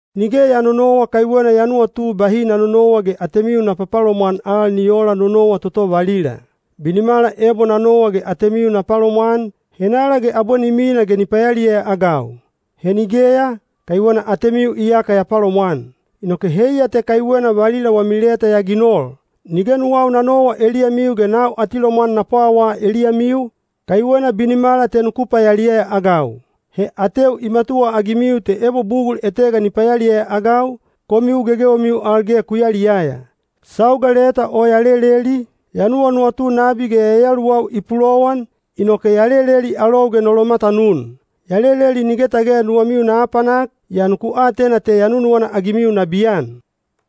Nige ya nonowa kaiwena ya nuwatu bahi na nonowa ge atemiu na papalomwan al ni oola no nowa toto valila. Binimala ebo na nowa ge atemiu na palomwan, henala ge abwe ni mina ge ni payaliyaya-agau? He nigeya, kaiwena atemiu iyaka ya palomwan. Inoke heiya te kaiwena valila wami leta ya ginol. Nige nuwau na nowa eliyamiu ge nau atilomwan na pwawaa eliyamiu, kaiwena binimala te nuku payaliyaya-agau. He ateu i matuwaagimiu te ebo bugul etega ni payaliyaya-agau, komiu gegewemiu al ge ku yaliyaya. Sauga leta o ya leleli, ya nuwanuwatu nabi ge yayaluwau i pulowan, inoke ya leleli alou ge no lomatanun. Ya leleli nige tage nuwamiu na apanak, yaa nuku atena te ya nunuwana-agimiu nabiyan.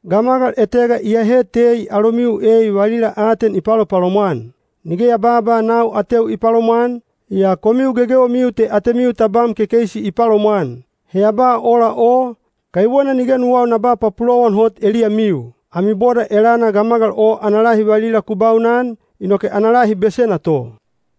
Gamagal etega iyahe tei alomiu ei valila aten i palopalomwan. Nige ya babaa nau ateu i palomwan, yaa komiu gegewemiu te atemiu tabam kekeisi i palomwan. (He ya ba ola o, kaiwena nige nuwau na ba papulowan hot eliyamiu.) Ami boda elana gamagal o ana lahi valila ku baunan, inoke ana lahi besena to.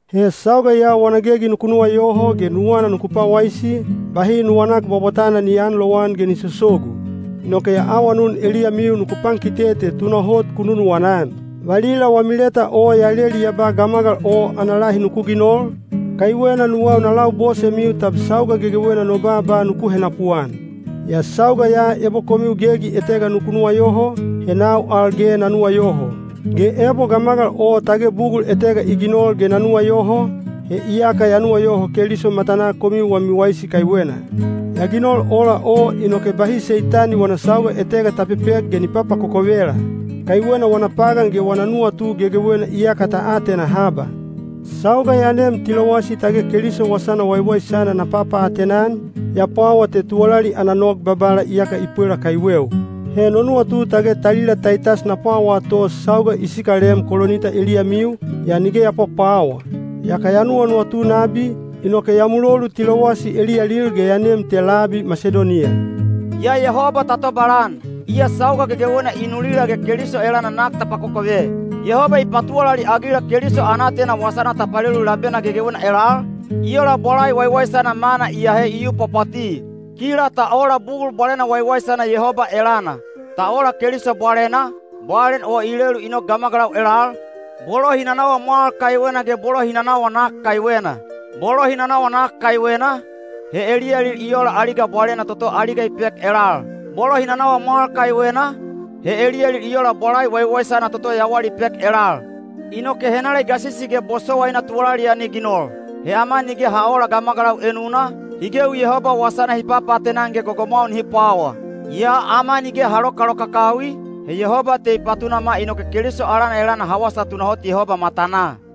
He sauga ya wana gegi nuku nuwayoho ge nuwana nuku pwawaisi, bahi nuwanak bwabwatana ni aanlowan ge ni sosogu. Inoke ya awanun eliyamiu nuku pankite te tunahot ku nunuwana-an. Valila wami leta o ya leli ya ba gamagal o ana lahi nuku ginol, kaiwena nuwau na labosemiu tab sauga gegewena no baaba nuku henapuan. Yaa sauga ya ebo komiu gegi etega nuku nuwayoho, he nau al ge na nuwayoho. Ge ebo gamagal o tage bugul etega i ginol ge na nuwayoho, he iyaka ya nuwayoho Keliso matanaa komiu wami waisi kaiwena. Ya ginol ola o inoke bahi Seitani wana sauga etega ta pepek ge ni papakokovela. Kaiwena wana pagan ge wana nuwatu gegewena iyaka ta atena haba. Sauga ya nem Tilowasi tage Keliso Wasana Waiwaisana na papaatena-an, ya pwawa te tuwalali ana nog Babala iyaka i pwela kaiweu. He no nuwatu tage talila Taitas na pwawaa to sauga i sikalem Kolinita eliyamiu, yaa nige ya pwapwawa. Yaka ya nuwanuwatu nabi, inoke ya mulolu Tilowasi eliyalil ge ya nem te labi Masidoniya. Yaa Yehoba ta tobalan! Iya sauga gegewena i nulila ge Keliso elana nak ta pakokove. Yehoba i patuwalali-agila Keliso ana aatena wasana ta palelu labena gegewena elal, i ola bwalai waiwaisana mana i ahe i yu pwapwati. Kila ta ola bugul bwalena waiwaisana Yehoba elana. Ta ola Keliso bwalena, bwalen o i lelu i nok gamagalau elal, bolo hi nanawa mwal kaiwena ge bolo hi nanawa nak kaiwena. Bolo hi nanawa nak kaiwena, he eliyalil i ola aliga bwalena toto aliga i pek elal; bolo hi nanawa mwal kaiwena, he eliyalil i ola bwalai waiwaisana toto yawal i pek elal. Inoke henala i gasisi ge bosowaina tuwalali ya ni ginol? He ama nige ha oola gamagalau enuna, hi gewi Yehoba wasana hi papaatena-an ge gogomwau nihi pwawaa. Yaa ama nige ha lokalokakawi, he Yehoba te i patunama inoke Keliso alana elana ha wasa tunahot Yehoba matanaa.